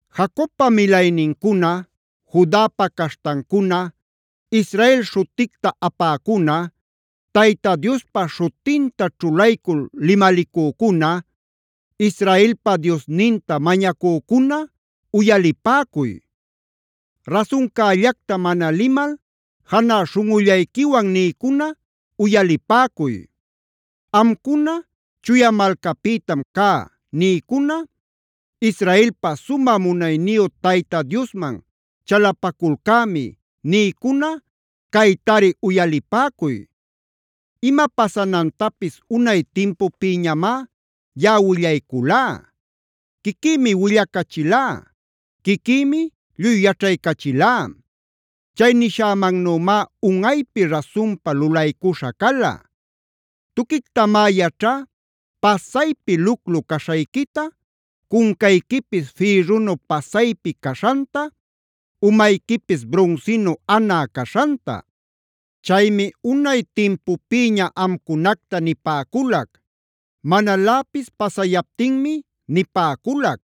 “Jacobpa milaynincuna, Judapa caśhtancuna, Israel śhuticta apäcuna, Tayta Diospa śhutinta ćhulaycul limalicücuna, Israelpa Diosninta mañacücuna uyalipäcuy; rasuncällacta mana limal janä śhunꞌullayquiwan nïcuna uyalipäcuy. Amcuna ‘Chuya malcapïtam cä’ nïcuna, ‘Israelpa sumä munayniyu Tayta Diosman chalapaculcämi’ nïcuna caytari uyalipäcuy. Ima pasanantapis unay timpupïñamá yaꞌa willayculá. Quiquïmi willacachilá; quiquïmi lluy yaćhaycachilá. Chay nishämannümá unꞌaypi rasunpa lulaycuśha cala. Tuquictamá yaćhá pasaypi luclu caśhayquita, cuncayquipis fïrrunu pasaypi caśhanta, umayquipis brunsinu anä caśhanta. Chaymi unay timpupïña amcunacta nipäculac; manaläpis pasayaptinmi nipäculac.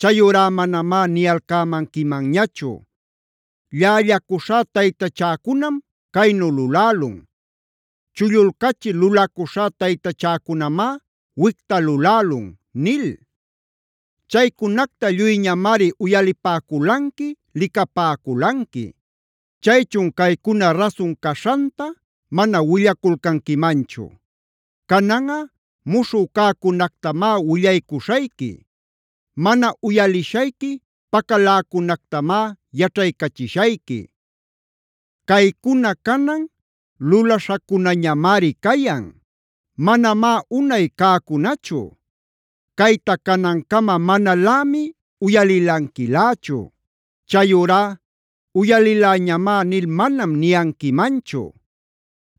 Chayurá manamá niyalcämanquimanñachu: ‘Llällacuśhá taytachäcunam caynu lulälun; chullulcachil lulacuśhá taytachäcunamá wicta lulälun’ nil. Chaycunacta lluyñamari uyalipäculanqui, licapäculanqui. ¿Chaychun caycuna rasun caśhanta mana willaculcanquimanchu? Cananꞌa muśhü cäcunactamá willaycuśhayqui; mana uyalishayqui pacaläcunactamá yaćhaycachishayqui. Caycuna canan lulaśhacunañamari cayan; manamá unay cäcunachu. Cayta canancama manalämi uyalilanquilächu. Chayurá ‘uyaliläñamá’ nil manam niyanquimanchu.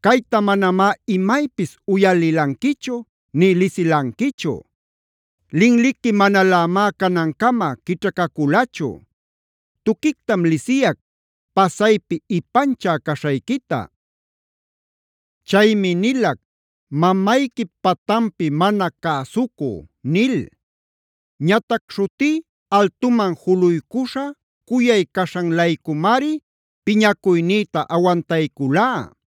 “Cayta manamá imaypis uyalilanquichu, nï lisilanquichu; linliqui manalämá canancama quićhacaculachu. Tuquictam lisiyac pasaypi ipanchä caśhayquita. Chaymi nilac: ‘Mamayquip patanpi mana cäsucü’ nil. Ñatac śhutí altuman juluycuśha, cuyay caśhan-laycumari piñacuynïta awantayculá;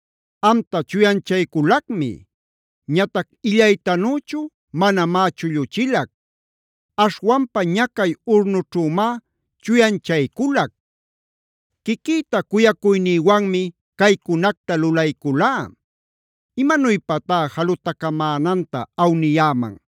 Amta chuyanchayculacmi. Ñatac illaytanüchu manamá chulluchilac. Aśhwanpa ñacay urnućhümá chuyanchayculac. Quiquïta cuyacuynïwanmi caycunacta lulayculá. ¿Imanuypatá jalutacamänanta awniyäman?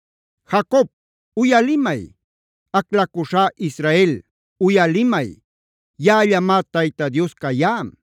“Jacob, uyalimay; aclacuśhá Israel uyalimay: Yaꞌallamá Tayta Dios cayá.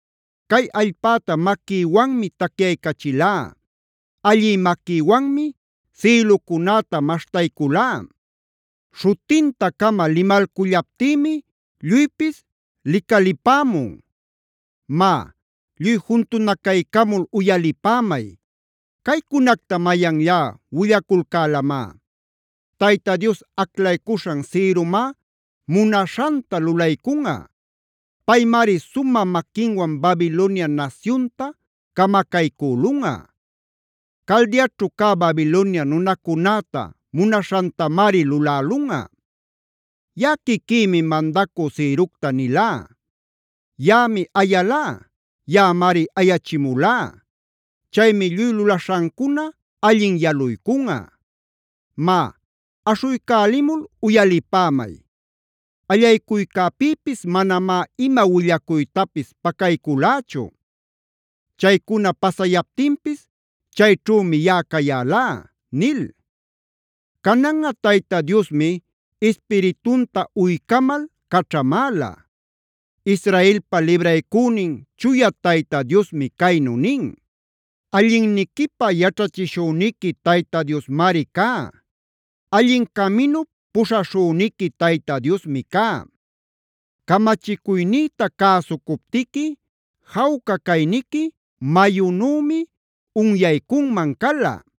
Cay allpäta maquïwanmi tacyaycachilá; allï maquïwanmi sïlucunäta maśhtayculá. Śhutinta-cama limalcullaptïmi lluypis licalipämun. “Má, lluy juntunacaycamul uyalipämay: ¿Caycunacta mayanllá willaculcälamá? Tayta Dios aclaycuśhan Ciromá munaśhanta lulaycunꞌa. Paymari sumä maquinwan Babilonia nasyunta camacaycülunꞌa; Caldeaćhu cä Babilonia nunacunäta munaśhantamari lulälunꞌa. “Yaꞌa quiquïmi mandacü Cirocta nilá; yaꞌami ayalá; yaꞌamari ayachimulá. Chaymi lluy lulaśhancuna allin yaluycunꞌa. Má, aśhuycälimul uyalipämay. Allaycuycäpïpis manamá ima willacuytapis pacayculächu. Chaycuna pasayaptinpis chayćhümi yaꞌa cayälá” nil. Cananꞌa Tayta Diosmi Ispiritunta uycamal caćhamäla. Israelpa libraycünin Chuya Tayta Diosmi caynu nin: “Allinniquipä yaćhachishüniqui Tayta Diosmari cá; allin caminup puśhaśhüniqui Tayta Diosmi cá. Camachicuynïta cäsucuptiqui jawca cayniqui mayunümi unyaycunman cala;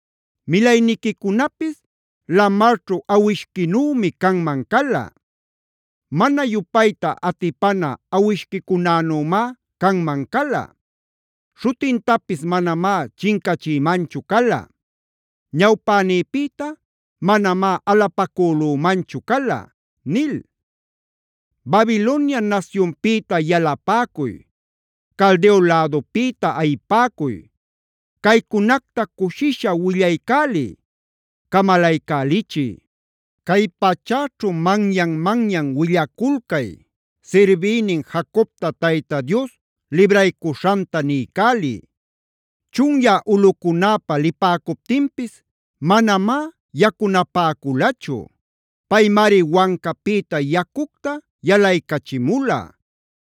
Milayniquicunapis lamarćhu awishquinümi canman cala; mana yupayta atipana awishquicunänümá canman cala.e Śhutintapis manamá chincachïmanchu cala; ñawpänïpïta manamá alapacülumanchu cala” nil. ¡Babilonia nasyunpïta yalapäcuy!f ¡Caldeo lädupïta ayipäcuy! Caycunacta cushisha willaycäliy, camalaycälichiy. Cay pachäćhu manyan-manyan willaculcay. Sirbïnin Jacobta Tayta Dios libraycuśhanta niycäliy. Chunyä ulꞌucunäpa lipäcuptinpis manamá yacunapäculachu. Paymari wancapïta yacucta yalaycachimula;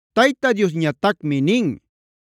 Tayta Diosñatacmi nin: